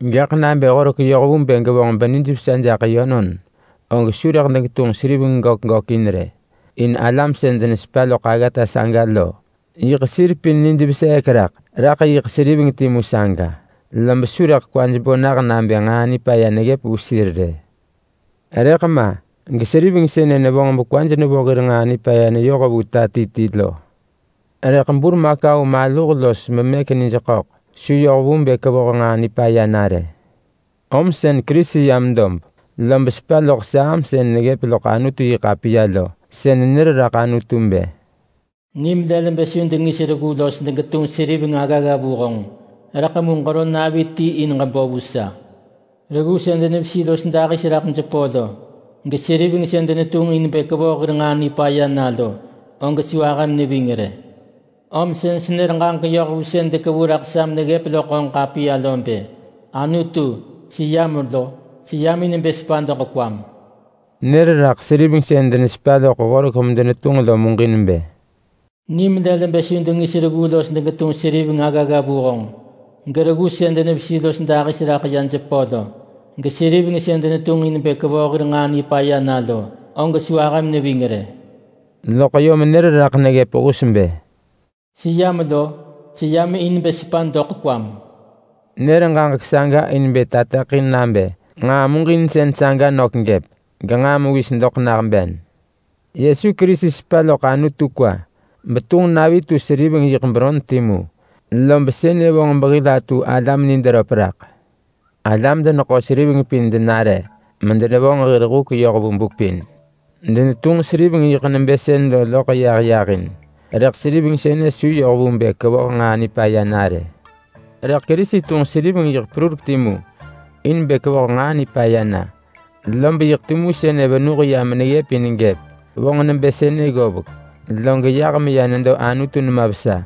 Gaḳ nabë Horek yoh vu bë gevonġ benijvesa jaḳ yönon, og su rëḳ degetunġ seriveng gök gökin rë. In alam sën denesepa loḳ aggata saga lo yiḳ sir pin nij veseek jaḳ jaḳ yiḳ seriveng timu saga lob su rëḳ kwaj bo nah nabë nġaa nipaya neggëp vu sir rë. Rëḳ ma geseriveng sënë nevonġ bekwaj nevo hir nġaa nipaya neyoh vu ta ti ti lo. Rëḳ burmakau maluh los memëk nij ḳöḳ su yoh vu bë kevoh nġaa nipaya na rë. Om sën Kerisi yam dob lob sepa loḳ Saam sën neggëp loḳ Anutu-yi-ḳapiya lo benër raḳ Anutu bë: “Nim lël bë su dengis reggu los degetunġ seriveng aggagga vu honġ, rëḳ mu ġero navi ti in ġebo vu sa. Reggu sën denevesi los dahis raḳ jepö lo, geseriveng sën denetunġ in bë kevoh hir nġaa nipaya na lo, og su ahëm neving rë. Om sën senër ġaġek yoh vu sën dekevu raḳ sa meneggëp loḳ honġ ḳapiya lo bë, ‘Anutu, seyam lo! Seyam in bë sepa doḳ kwam!’” Nër raḳ seriveng sën denesepa loḳ Horek medenetunġ lo muġin bë, “Nim lël bë su dengis reggu los degetunġ seriveng aggagga vu honġ, gereggu sën denevesi los dahis raḳ ya jepö lo, geseriveng sën denetunġ in bë kevoh hir nġaa nipaya na lo, og su ahëm neving rë.” Loḳ yom nër raḳ neggëp hus bë, “Seyam lo! Seyam in bë sepa doḳ kwam!” Nër ġaġek saga in bë tateḳin nabë nġaa muġinsën saga nök gëp, genġaa mewis doḳ nah ben. Yesu Kerisi sepa loḳ Anutu kwa betunġ navi netu seriveng yiḳ beron timu, lob sënë vonġ behil atu alam nid röp raḳ. Alam-deneḳo-seriveng pin denare medenevonġ hir huk yoh vu buk pin. Denetunġ seriveng yiḳ nebë sën lo loḳ yah yahin, rëḳ seriveng sënë su yoh vu bë kevoh nġaa nipaya na rë. Rëḳ Kerisi tunġ seriveng yiḳ perurek timu in bë kevoh nġaa nipaya na, lob yiḳ timu sënë venuh ya meneggëp in gëp. Vonġ nebë sënë ggovek, log yah meya nedo Anutu nema vesa,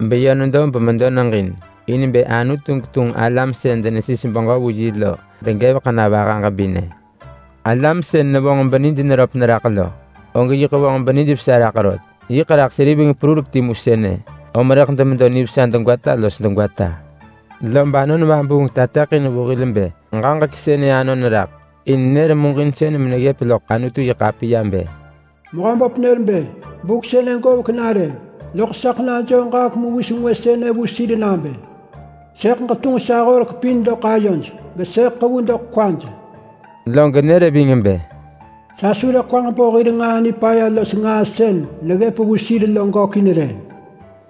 beyö nedo bemedo neġin in bë Anutu getunġ alam sën denesis beġö vu yi lo degevek na vaha ġebinë. Alam sën nevonġ benij röp neraḳ lo, og yiḳ vonġ benijvesa raḳ rot. Yiḳ raḳ seriveng perurek timu sënë, om rëḳ demedo nivesa degwata los degwata. Lob Anon Vabuung tateḳin vu hil bë ġaġek sënë anon raḳ in nër muġinsën meneggëp loḳ Anutu-yi-ḳapiya bë: “Mehöböp nër bë, ‘Buk sënë govek na rë, loḳ saḳ najoo ġaġek mewis ngwë sënë vu sir nabë: Sëḳ ġetunġ sa horek pin doḳ ayoj, gesëḳ ḳevu doḳ kwaj.’” Log nër ving bë, “Sa su rëḳ kwaġ bo hir nġaa nipaya los nġaa sën neggëp vu sir lo gökin rë.”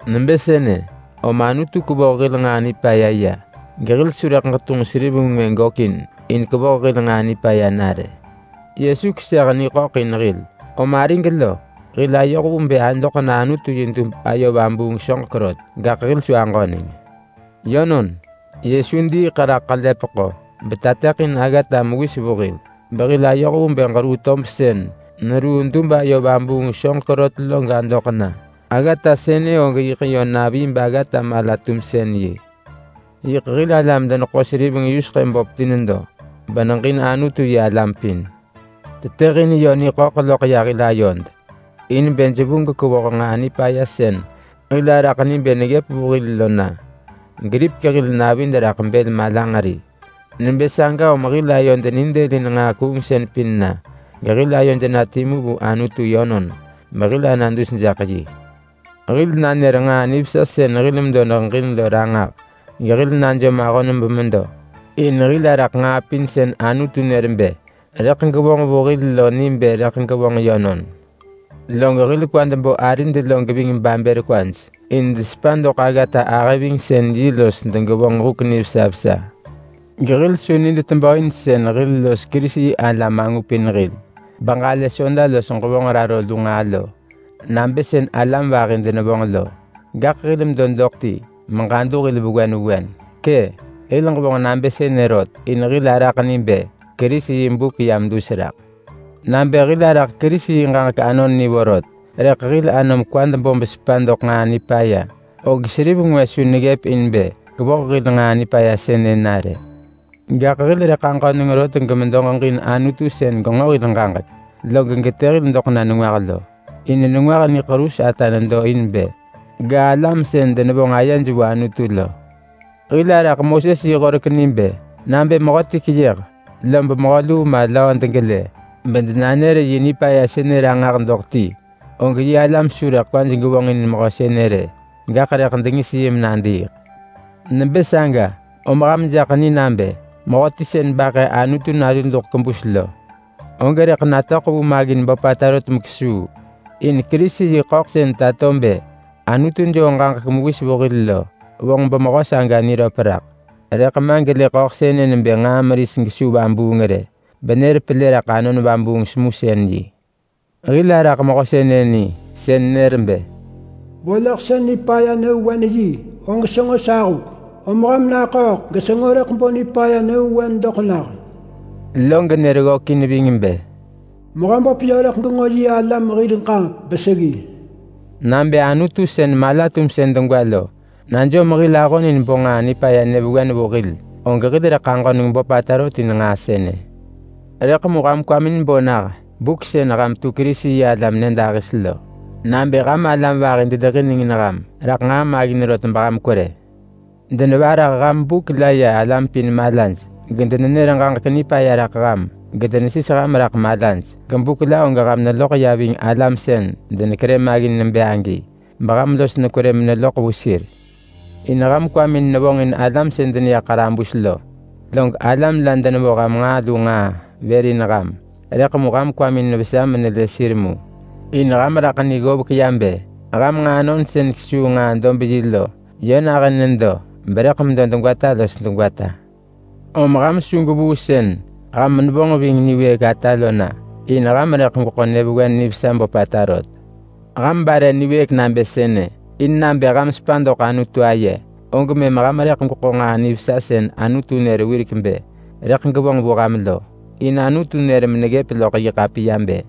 Nebë sënë, om Anutu kevoh hil nġaa nipaya ya, gehil su rëḳ ġetunġ seriveng ngwë gökin in kevoh hil nġaa nipaya na rë. Yesu keseh niḳöḳ in hil, om arig lo, hil ayoh vu bë adoḳ na Anutu yi dub ayo vabuung soġek rot, gaḳ hil su aġöneng. Yönon, Yesu diiḳ raḳ ḳelepeḳo betateḳin aggata mewis vu hil behil ayoh vu bë ġeruu tob sën neruu dub ayo vabuung soġek rot lo gadoḳ na. Aggata sënë og yiḳ yö navi baggata-mala-tumsën-yi. Yiḳ hil alam-deneḳo-seriveng yuseḳë böp ti nedo, beneġin Anutu-yi-alam pin. Tetëhin yö niḳöḳ loḳ ya hil ayod in bë jevu gekevoh nġaa nipaya sën hil araḳ ni bë neggëp vu hil lo na. Geripek hil navid raḳ bël malanġeri. Nebë saga om hil ayod nidëlin nġaa kuungsën pin na, gehil ayod na timu vu Anutu yönon behil ana dus jaḳ yi. Hil nanër nġaa nivesa sën hil medo neheġin lo ranġah gehil najom ahon bemedo. In hil araḳ nġaa pin sën Anutu nër bë rëḳ gevonġ vu hil lo ni bë rëḳ gevonġ yönon. Log hil kwad bo arid lo geving babër kwaj in desepa doḳ aggata-ahëvingsën-yi los degevonġ huk nivesa vesa. Gehil su nid tebö in sën hil los Kerisi-yi-alam angupin hil beġalë Soda los ġevonġ raro lu nġaa lo, nabë sën alam vahi nij tebö raḳ lo. Gaḳ hil medo doḳ ti meġadu hil vewen vewen. Kë, hil ġevonġ nabë sënë rot in hil araḳ ni bë Kerisi yi buk yam dus raḳ. Nabë hil araḳ Kerisi yi ġaġek anon ni vorot, rëḳ hil anom kwad bo besepa doḳ nġaa nipaya, og seriveng ngwë su neggëp in bë kevoh hil nġaa nipaya sënë na rë. Gaḳ hil rëḳ aġöneng rot gemedo ġeġin sën Anutu genġo hil ġaġek log getë hil doḳ na nengwah lo. In nengwah niḳerus ata nedo in bë ga alam sën denevonġ ayej vu Anutu lo. Hil araḳ Moses yi Horek ni bë: Nabë mehöti keyëh, lob mehö luu ma mehö löö degelë bedenanër yi nipaya sënë ranġah doḳ ti, og yi alam su rëḳ kwaj gevonġin mehö sënë rë, gaḳ rëḳ dengis yi menadiiḳ. Nebë saga, om ham jaḳ ni nabë mehöti sën baḳë Anutu Nalu duḳ kebus lo, og rëḳ natöḳ vu maggin böpata rot mekesuu. In Kerisi yi ḳöḳ sën tato bë Anutu joo ġaġek mewis vu hil lo vonġ bemehö saga niröp raḳ. Rëḳ ma gelë ḳöḳ sënë nebë nġaa meris gesu vabuung rë, benër pelë raḳ Anon Vabuung semusën-yi. Hil araḳ Mehö sënë ni, sën nër bë, “Vo loḳsën nipaya nyëvewen og senġo sa huk. Om ham naḳööḳ gesenġo rëḳ bo nipaya nyëvewen doḳ nah.” Log nër ggökin ving bë, “Mehöböp yö rëḳ genġo yi alam hir ġaġek beseggi.” Nabë Anutu sën mala-tumsën degwa lo najom hil ahon in bo nġaa nipaya nyëvewen vu hil, og hil rëḳ aġöneng böpata rot in nġaa sënë. Rëḳ mu ham kwamin bo nah buk sën ham tu Kerisi-yi-alam nyëdahis lo nabë ham alam vahi dedeġinengin ham raḳ nġaa maggin rot beham kwerë. Denevarah ham buk la ya alam pin malaj, gedenenër ġaġek nipaya raḳ ham, gedenesis ham raḳ malaj. Gebuk la og ham neloḳ ya ving alam sën denekerë maggin nebë agi, beham los nekwerë meneloḳ vu sir. In ham kwamin nevonġin alam sën deneya ḳarabus lo. Log alam la denevo ham nġaa lu nġaa vër in ham, rëḳ mu ham kwamin vesa menelë sir mu. In ham raḳ ni ggovek ya bë ham nġaanon sën kesuu nġaa-dob-yi lo, yö nahën nedo berëḳ medo degwata los degwata. Om ham su gwevuu sën ham nevonġ ving niwëëk ata lo na, in ham rëḳ gweḳo nyëvewen nivesa böpata rot. Ham bare niwëëk nabë sënë in nabë ham sepa doḳ Anutu aye, og mëm ham rëḳ gweḳo nġaa nivesa sën Anutu nër wirek bë rëḳ gevonġ vu ham lo. In Anutu nër meneggëp loḳ yi ḳapiya bë,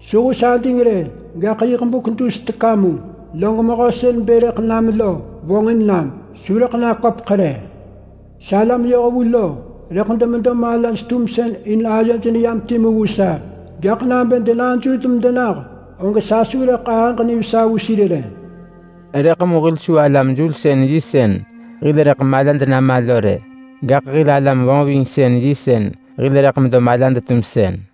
“Su hus ading rë, gaḳ yiḳ buk dus teka mu, log mehö sën bë rëḳ nam lo vonġin nam. Su rëḳ naköpeḳ rë. Salam yohvu lo rëḳ demedo malaj-tumsën in ayoj neyam timu vu sa. Gaḳ nabë denajul medenah, og sa su rëḳ ahëġ nivesa vu sir rë.” Rëḳ mu hil su alam-julsën-yi sën hil rëḳ malad nama lo rë. Gaḳ hil alam-vonġvingsën-yi sën hil rëḳ medo malad-tumsën.